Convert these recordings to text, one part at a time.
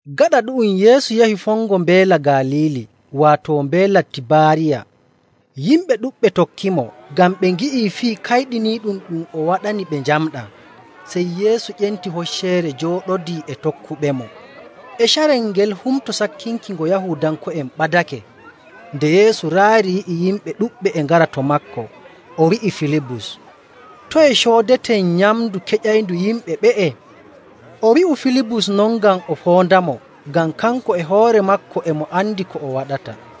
Gaɗa ɗu'um, Yeesu yahi fongo Mbeela Galiili, waato Mbeela Tibaariya. Yimɓe ɗuɗɓe tokkimo, ngam ɓe ngi'i fii kayɗiniiɗum ɗum o waɗani ɓe njamɗaa. Sey Yeesu ƴenti hocceere jooɗodii e tokkuɓemo. E carel ngel Humto Sakkinki ngo Yahuudanko'en ɓadake. Nde Yeesu raari yi'i yimɓe ɗuɗɓe e ngara to maako, o wi'i Filibus, “Toye coodeten nyamndu keƴayndu yimɓe ɓe'e?” O wi'u Filibus non ngam o foondamo, ngam kanko e hoore maako e mo andi ko o waɗata.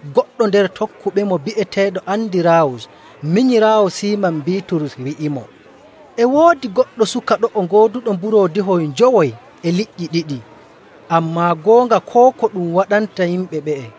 Goɗɗo nder tokkuɓemo bi'eteeɗo Andiraawus minyiraawo Siiman Biiturus wi'imo, “E woodi goɗɗo suka ɗo'o gooduɗo mburoodihoy njowoy e liƴƴi ɗiɗi. Ammaa goonga koo ko ɗum waɗanta yimɓe ɓe'e.”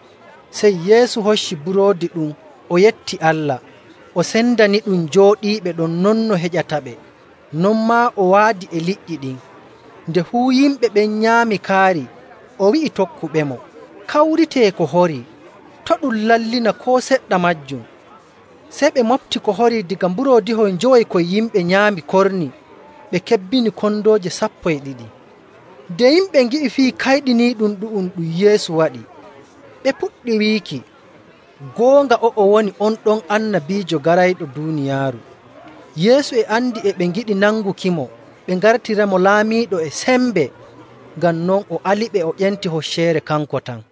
Sey Yeesu hocci buroodi ɗum, o yetti Allah, o sendaniɗum jooɗiiɓe ɗon non no heƴataɓe. Non maa o waadi e liƴƴi ɗin. Nde fuu yimɓe ɓen nyaami kaari, o wi'i tokkuɓemo, “Kawritee ko horii, to' ɗum lallina koo seɗɗa maajum.” Sey ɓe moɓti ko horii daga mburoodihoy njowoy koy yimɓe nyaami korni, ɓe kebbini kondooje sappo e ɗiɗi. Nde yimɓe ngi'i fii kayɗiniiɗum ɗu'um ɗum Yeesu waɗi, ɓe puɗɗi wiiki, “Goonga o'o woni on ɗon annabiijo garayɗo duuniyaaru.” Yeesu e andi e ɓe ngiɗi nangukimo, ɓe ngartiramo laamiiɗo e sembe. Ngam non o aliɓe o ƴenti hocceere kanko tan.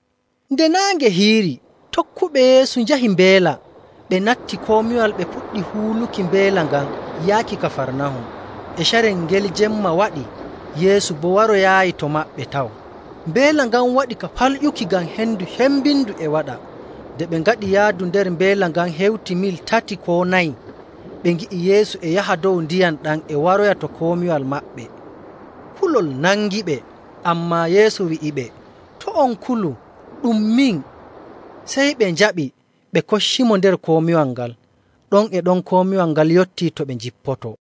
Nde naange hiiri, tokkuɓe Yeesu njahi mbeela, ɓe natti komiwal, ɓe puɗɗi huuluki mbeela ngan yaaki Kafarnahum. E carel ngel jemma waɗii, Yeesu boo waroyaayi to maɓɓe taw. Mbeela ngan waɗi ka falƴuki ngam hendu cembindu e waɗa. Nde ɓe ngaɗi yaadu nder mbeela ngan hewti mil tati koo nayi, ɓe ngi'i Yeesu e yaha dow ndiyam ɗam e waroya to komiwal maɓɓe, kulol nangiɓe. Ammaa Yeesu wi'iɓe, “To' on kulu, ɗum min.” Sey ɓe njaɓi ɓe koccimo nder komiwal ngal, ɗon e ɗon komiwal ngal yottii to ɓe njippotoo.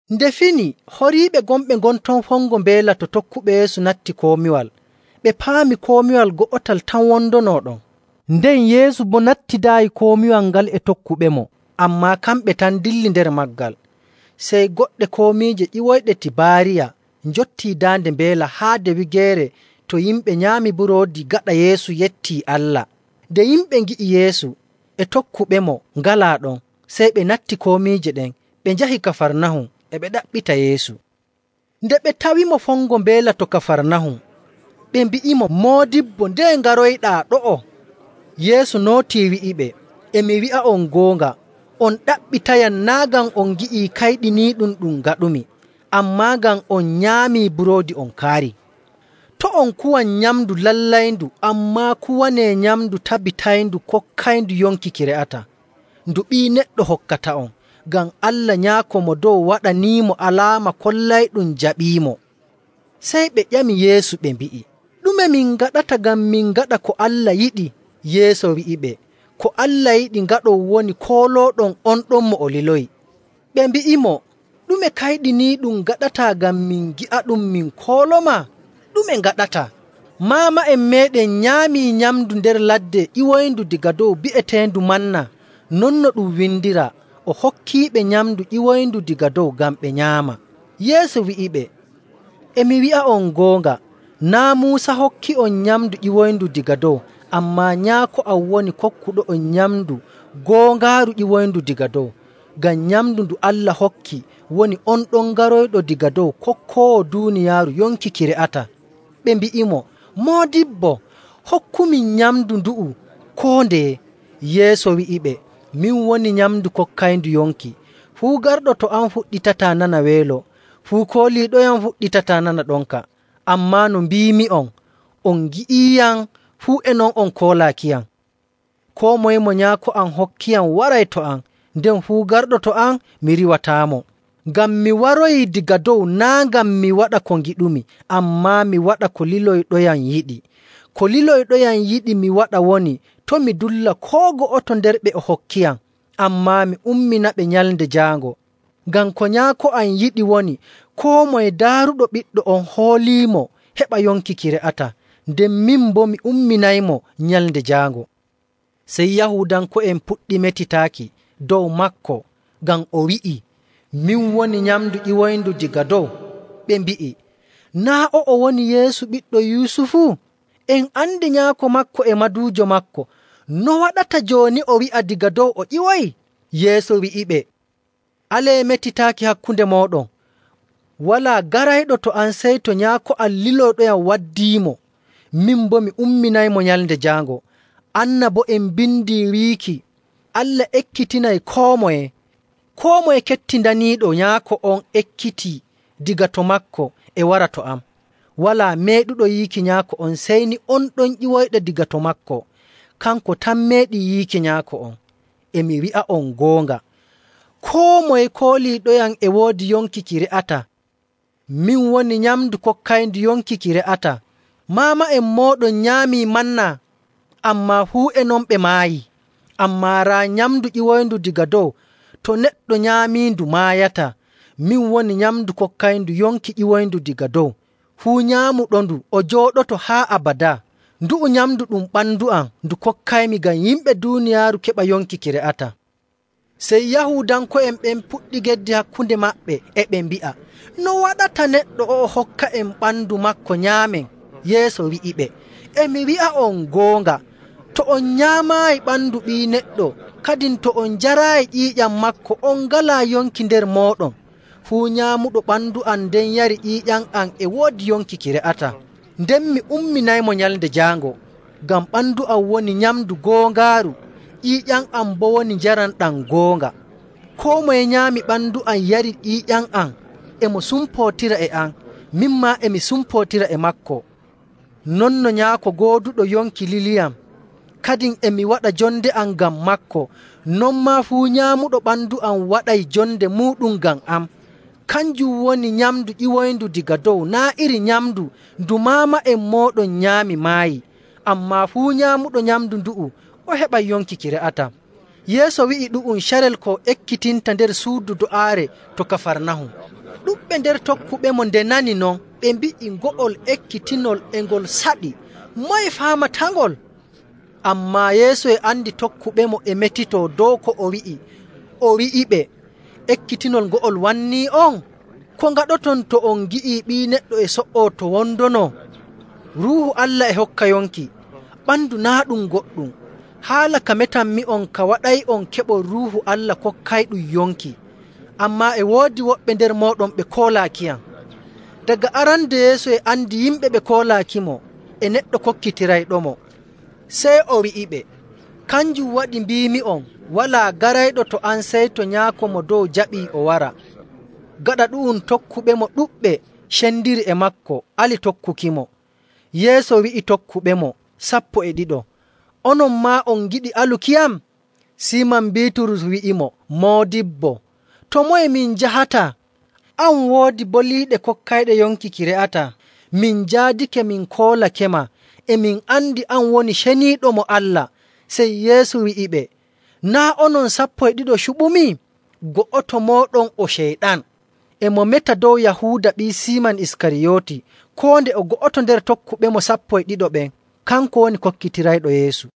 Nde fini, horiiɓe gonɓe ngon ton fongo mbeela to tokkuɓe Yeesu natti komiwal, ɓe paami komiwal go'otal tan wondono ɗon, nden Yeesu boo nattidaayi komiwal ngal e tokkuɓemo, ammaa kamɓe tan ndilli nder maagal. Sey goɗɗe komiije ƴiwoyɗe Tibaariya njottii daande mbeela haade wigeere to yimɓe nyaami buroodi gaɗa Yeesu yettii Allah. Nde yimɓe ngi'i Yeesu e tokkuɓemo ngalaa ɗon, sey ɓe natti komiije ɗen, ɓe njahi Kafarnahum e ɓe ɗaɓɓita Yeesu. Nde ɓe tawimo fongo mbeela to Kafarnahum, ɓe mbi'imo, “Moodibbo, ndeye ngaroyɗaa ɗo'o?” Yeesu nootii wi'iɓe, “E mi wi'a'on goonga, on ɗaɓɓitayam naa' ngam on ngi'ii kayɗiniiɗum ɗum ngaɗumi, ammaa ngam on nyaamii buroodi on kaarii. To' on kuwan nyamndu lallayndu, ammaa kuwanee nyamndu tabbitayndu kokkayndu yonki ki re'ataa, ndu Ɓii Neɗɗo hokkata'on, ngam Allah Nyaako Mo Dow waɗaniimo alaama kollayɗum jaɓiimo.” Sey ɓe ƴami Yeesu ɓe mbi'i, “Ɗume min ngaɗata ngam min ngaɗa ko Allah yiɗi?” Yeesu wi'iɓe, “Ko Allah yiɗi ngaɗon woni koolooɗon on ɗon mo o liloyi.” Ɓe mbi'imo, “Ɗume kayɗiniiɗum ngaɗataa ngam min ngi'aɗum min koolomaa? Ɗume ngaɗataa? Maama'en meeɗen nyaamii nyamndu nder ladde ƴiwoyndu daga dow bi'eteendu manna, non no ɗum windiraa, ‘O hokkiiɓe nyamndu ƴiwoyndu daga dow ngam ɓe nyaama.’”. Yeesu wi'iɓe, “E mi wi'a'on goonga, naa' Muusa hokki'on nyamndu ƴiwoyndu daga dow, ammaa Nyaako am woni kokkuɗo'on nyamndu goongaaru ƴiwoyndu daga dow. Ngam nyamndu ndu Allah hokki woni on ɗon garoyɗo daga dow kokkoowo duuniyaaru yonki ki re'ataa.” Ɓe mbi'imo, “Moodibbo, hokkumin nyamndu ndu'u koo ndeye.” Yeesu wi'iɓe, “Min woni nyamndu kokkayndu yonki. Fuu garɗo to am fuɗɗitataa nana weelo, fuu kooliiɗoyam fuɗɗitataa nana ɗonka. Ammaa no mbiimi'on, on ngi'iiyam, fuu e non on koolaakiyam. Koo moye mo Nyaako am hokkiyam waray to am, nden fuu garɗo to am mi riiwataamo. Ngam mi waroyii daga dow naa' ngam mi waɗa ko ngiɗumi, ammaa mi waɗa ko liloyɗoyam yiɗi. Ko liloyɗoyam yiɗi mi waɗa woni, to' mi dulla koo go'oto nder ɓe o hokkiyam, ammaa mi umminaɓe Nyalnde Jaango. Ngam ko Nyaako am yiɗi woni koo moye daaruɗo Ɓiɗɗo on hooliimo heɓa yonki ki re'ataa, nden min boo mi umminaymo Nyalnde Jaango.” Sey Yahuudanko'en puɗɗi metitaaki dow maako, ngam o wi'ii, “Min woni nyamndu ƴiwoyndu daga dow.” Ɓe mbi'i, “Naa' o'o woni Yeesu ɓiɗɗo Yusufu? En andi nyaako maako e maduujo maako. No waɗata jooni o wi'a daga dow o ƴiwoyi?” Yeesu wi'iɓe, “Alee metitaaki hakkunde mooɗon. Walaa garayɗo to am sey to Nyaako am liloyɗoyam waddiimo, min boo mi umminaymo Nyalnde Jaango. Annabo'en mbindii wiiki, ‘Allah ekkitinay koo moye.’ Koo moye kettindaniiɗo Nyaako on ekkitii daga to maako e wara to am.. Walaa meeɗuɗo yiiki Nyaako on sey ni on ɗon ƴiwoyɗo daga to maako, kanko tan meeɗi yiiki Nyaako on. E mi wi'a'on goonga, koo moye kooliiɗoyam e woodi yonki ki re'ataa. Min woni nyamndu kokkayndu yonki ki re'ataa. Maama'en mooɗon nyaamii ‘manna,’ ammaa fuu e non ɓe maayii. Ammaa raa nyamndu ƴiwoyndu daga dow, to neɗɗo nyaamiindu maayataa. Min woni nyamndu kokkayndu yonki ƴiwoyndu daga dow. Fuu nyaamuɗondu, o jooɗoto haa abadaa. Ndu'u nyamndu ɗum ɓandu am, ndu kokkaymi ngam yimɓe duuniyaaru keɓa yonki ki re'ataa.” Sey Yahuudanko'en ɓen puɗɗi geddi hakkunde maɓɓe, e ɓe mbi'a, “No waɗata neɗɗo o'o hokka'en ɓandu maako nyaamen?” Yeesu wi'iɓe, “E mi wi'a'on goonga, to on nyaamaayi ɓandu Ɓii Neɗɗo, kadin to on njaraayi ƴiiƴam maako, on ngalaa yonki nder mooɗon. Fuu nyaamuɗo ɓandu am nden yari ƴiiƴam am e woodi yonki ki re'ataa, nden mi umminaymo Nyalnde Jaango. Ngam ɓandu am woni nyamndu goongaaru, ƴiiƴam am boo woni njaram ɗam goonga. Koo moye nyaami ɓandu am yari ƴiiƴam am, e mo sumpootira e am, min maa e mi sumpootira e maako. Non no Nyaako gooduɗo yonki liliyam, kadin e mi waɗa jonde am ngam maako, non maa fuu nyaamuɗo ɓandu am waɗay jonde muuɗum ngam am. Kanjum woni nyamndu ƴiwoyndu daga dow naa' iri nyamndu ndu maama'en mooɗon nyaami maayi. Ammaa fuu nyaamuɗo nyamndu ndu'u o heɓay yonki ki re'ataa.” Yeesu wi'i ɗu'um carel ko o ekkitinta nder suudu do'aare to Kafarnahum. Ɗuɗɓe nder tokkuɓemo nde nani non, ɓe mbi'i, “Ngo'ol ekkitinol e ngol saɗi. Moye faamatangol?” Ammaa Yeesu e andi tokkuɓemo e metitoo dow ko o wi'i, o wi'iɓe, “Ekkitinol ngo'ol wanni'on? Ko ngaɗoton to on ngi'ii Ɓii Neɗɗo e so''oo to wondono? Ruuhu Allah e hokka yonki. Ɓandu naa' ɗum goɗɗum. Haala ka metanmi'on ka waɗay'on keɓon Ruuhu Allah kokkayɗum yonki. Ammaa e woodi woɓɓe nder mooɗon ɓe koolaakiyam.” Daga arande Yeesu e andi yimɓe ɓe koolaakimo e neɗɗo kokkitirayɗomo. Sey o wi'iɓe, “Kanjum waɗi mbiimi'on walaa garayɗo to am sey to Nyaako Mo Dow jaɓii o wara.” Gaɗa ɗu'um tokkuɓemo ɗuɗɓe cendiri e maako ali tokkukimo. Yeesu wi'i tokkuɓemo sappo e ɗiɗo, “Onon maa on ngiɗi alukiyam?” Siiman Biiturus wi'imo, “Moodibbo, to moye min njahata? An woodi boliiɗe kokkayɗe yonki ki re'ataa. Min njaadake min koolakema, e min andi an woni Ceniiɗo mo Allah.”. Sey Yeesu wi'iɓe, “Naa' onon sappo e ɗiɗo cuɓumi? Go'oto mooɗon o Ceyɗan!” E mo meta dow Yahuuda ɓii Siiman Iskariyooti, koo nde o go'oto nder tokkuɓemo sappo e ɗiɗo ɓen, kanko woni kokkitirayɗo Yeesu.